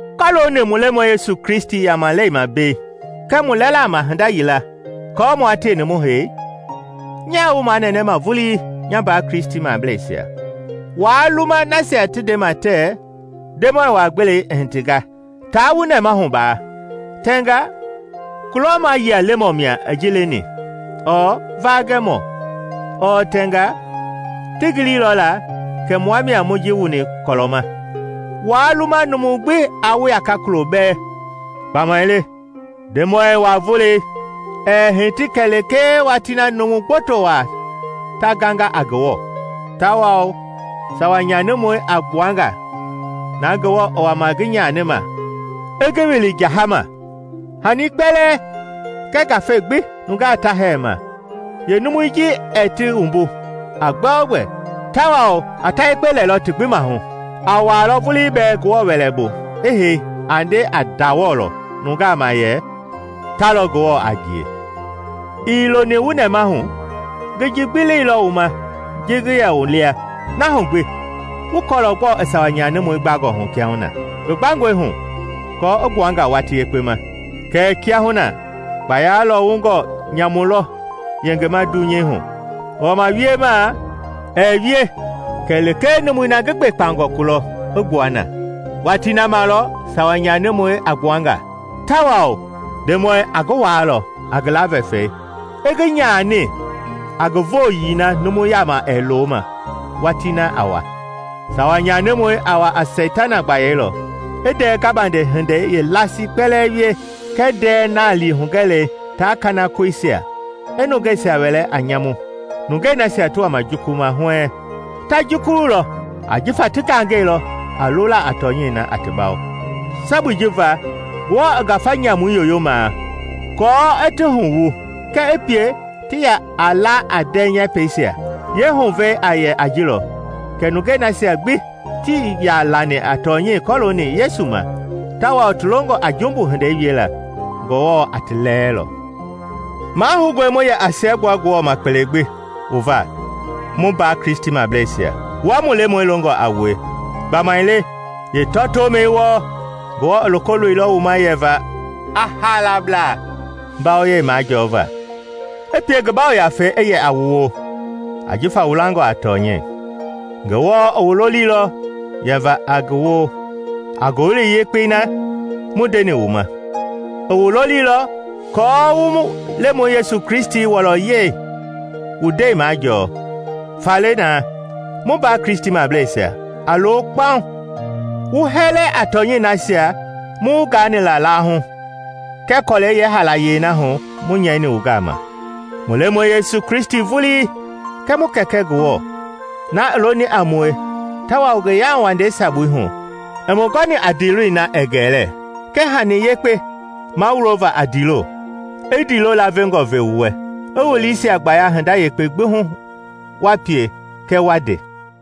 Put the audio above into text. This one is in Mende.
Kɔɔlooni mu Lemɔi Yesu Kristi yamalei ma mbei kɛɛ mu lɛla ma hinda yila aako mua tieni mu hei, nyaa wu manɛnɛma vulii, nya mbaa Kristimableisia, waa luma nasia ti ndema tɛɛ Ndemɔi wa-gbelei i hitinga taa wu nɛmahu baa. Tɛngaa kulɔmayia lemɔ mia i ji leni ɔɔ vaagɛmɔ, ɔɔ tɛnga ti gililɔla kɛ mua mia mu ji wuni kɔlɔ ma. Waa luma numu gbi aa wu yaka kulo bɛɛ. Gbamaile Ndemɔi wa-Volei ɛɛ hiti kɛlee watii na numu gboto waa ta ganga a Ngewɔ, tawao Sawa Nyanimɔi a gbuanga, na Ngewɔ i wama ngi nyanima i ngi wili jahama. Hanii kpɛlɛɛ kɛɛ ngafei gbi nungaa ta hɛɛ ma, yeenumui ji ɛɛ ti wumbu a gbɛogbɛ tawao a ta yekpe lɛlɔ ti gbi maahu. A wuaalɔ vulii bɛɛ Ngewɔ wɛlɛ bu i hei a nde a ndawɔlɔ nungaa ma yɛ ta lɔ Ngewɔ a ngie. Ii loni wu nɛmahu? Ngi ji gbi leilɔ wu ma ji ngi yɛ wu lia. Na hu gbi wu kɔɔlɔ gbɔɔ i Sawa Nyanimɔi gbangɔhu kiahuna. Ngi gbangɔi hu aako i gbuanga watii yekpe ma. Kɛɛ kiahuna kpaya Lɔwungɔ Nyamulɔ yengema dunyei hu, i wama wiema ɛɛ wie kɛlee numui na ngi gbekpangɔ kulɔ i gbua na. Watii na ma lɔ sawa nyanimɔi a gbuanga, tawao Ndemɔi Yesu a ngi waalɔ a ngi laavɛfɛi, i ngi nyani a ngi vooyii na numu yaama ɛɛ loo ma watii na a wa. Sawa nyanimɔi a wa a seitana gbayei lɔ i ndɛɛ gabande hindei yeelasii kpɛlɛɛ wie kɛɛ ndɛɛ naali hugɛlei taa kanakoisia, i nungeisia wɛlɛ a nyamu, nungei nasia ti wama jukuluma huɛɛŋ. Ta jukululɔ ajifa ti gangɛilɔ a lola a tɔnyɛi na a ti bawo. Sabui ji va Ngewɔ i ngafa nyamui yoyoma kɔɔ i ti huwu kɛɛ i pie ti ya a la a ndɛɛ yɛpɛisia. Yeehuvɛi a yɛ a ji lɔ kɛ nungei nasia gbi tii ya lani a tɔnyɛi kɔlooni Yesu ma tawao ti longɔ a jumbu hindei wiela, Ngewɔ a ti lɛɛlɔ. Mahoungɔe mu yɛ a siɛgbua Ngewɔ ma kpele gbi wu va, mu mbaa Kristimableisia, wua mu Lemɔi longɔ a wue. Gbamaile yeetɔtoomɛi wɔɔ Ngewɔ i loko loilɔ wu ma yɛva a haalablaa mbawoyei majɔɔva, i pie ngi Yafei i wu yɛ a ngi woo, ajifa wu langɔ a tɔnyɛi. Ngewɔ i wu loliilɔ yɛva a ngi woo a Ngowili Yekpei na mu ndeni wu ma; i wu loliilɔ aako wu mu Lemɔi Yesu Kristi wɔlɔyɛi wu ndɛi majɔɔ. Faale na, mu mbaa Kristimableisia, a lo kpaŋ, wu hɛlɛ a tɔnyɛi nasia mu wu gaani la laahu kɛɛ kɔlɛi yeehaalayei na hu mu nyɛini wu gama. Mu Lemɔi Yesu Kristi vulii, kɛɛ mu Kɛkɛ Ngewɔ, na i loni a mue tawao ngi yauwandei sabui hu i mu gɔni a ndiiloi na ɛɛ gɛlɛ kɛɛ hani yekpe mawulova a ndiilo, i ndiilo laavengɔ ve wu wɛ, i wu liisia gbaya hinda yekpe gbi hu wa pie kɛɛ wa nde.